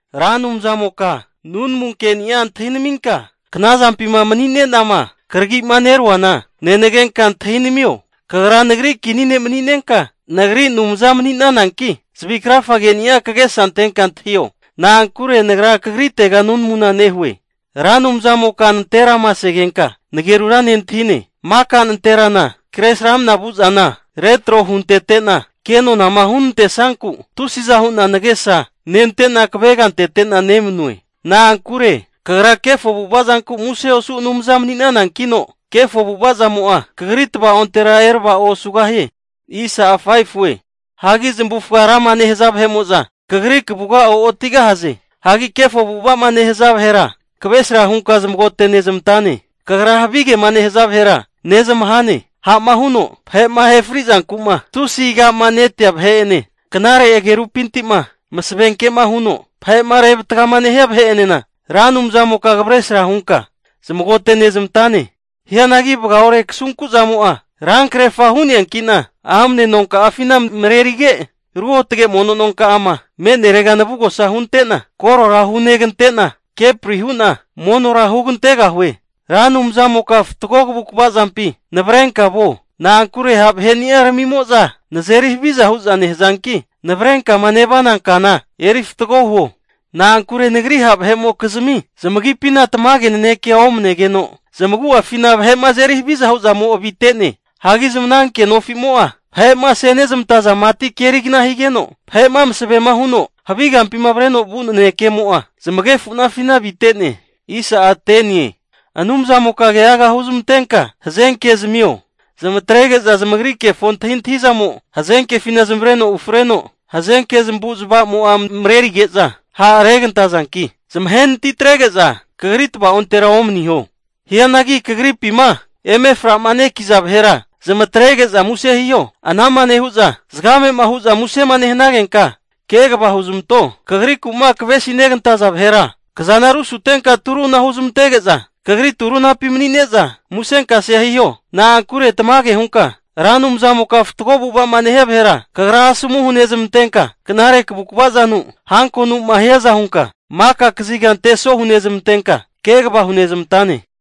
Ra Anumzamoka, nunamu keni'a antahinaminka, knazampima mani'ne'nama kragima neruana, nenagenka antahinamio. Kagra nagri kini ne' mani'nenka, nagri Anumza mani'nananki, zavi krafage'nia kagesa antenka antahio. Na'ankure nagra kagritega nunamuna nehue. Ra Anumzamoka nanterama segenka nagerura nentahine, maka nanterana Kresramanama vu'zana retro huntete'na kenonama hunantesanku tusiza hu'na nagesa nente'na kavegantete'na nemanue. Na'ankure kagra kefo avu'avazanku muse osu Anumza mani'nanankino, kefo avu'avazamo'a kagri tavaontera erava'o osugahie. Hagi zamavufaga rama nehaza vahe'mo'za kagri kavuga o'otigahaze. Hagi kefo avu'a'ma nehaza vahera kavresra hunka zamagote nezmantane. Kagra havigema nehaza vahera nezmahane. Ha'ma huno vahe'ma ahefri zanku'ma tusi aga'manetea vahe'ene, knare agerupinti'ma masavenkema huno vahe'ma revatgama nehia vahe'enena, Ra Anumzamoka kavresa hunka zamagote'nezmantane. Hianagi vagaore kasunku'zamo'a rankrerfa hu'neanki'na amne nonka'afina marerige, ruotge mono nonka'ama me'nerega navugosa hunte'na korora hunegante'na keprihu'na monora hugantegahue. Ra Anumzamoka fatgo kavukavazampi navrenka vuo, na'ankure ha' vahe'niaramimoza nazeri haviza hu'za nehazanki, navrenkama nevana kana eri fatgo huo. Na'ankure nagri ha' vahe'mokizmi zamagipina tamage nanekea omnegeno, zamagu'afina vahe'ma azeri haviza hu'zamo avite'ne. Hagi zamananke nofimo'za, vahe'ma asenezmantaza mati kerigna higeno, vahe'ma masavema huno havi kampima avreno vu nanekemo'a, zamagefu'nafina avite'ne. Anumzamoka keaga huzmantenka hazenke zamio, zamatrege'za zamagri kefo antahintahizamo, hazenkefina zamavareno ufreno. Hazenke zamavu'zmavamo'a marerige'za ha'regantazanki, zamahe natitrege'za kagri tava'ontera omaniho. Hianagi kagripima eme fra'manekiza vahera zamatrege'za muse hiho. Anama nehu'za zagamema hu'za musena nehanagenka, kegava huzmanto. Kagriku'ma kavesinegantaza vahera kazana rusutenka turunara huzmantege'za kagri turunapi mani'ne'za musenkasea hiho. Na'ankure tamage hunka Ra Anumzamoka fatgo avu'ava'ma nehia vahera kagra asomu hunezmantenka, knare kavukavazanu hankonuma hiaza hunka maka kaziga anteso hunezmantenka kegava hunezmantane.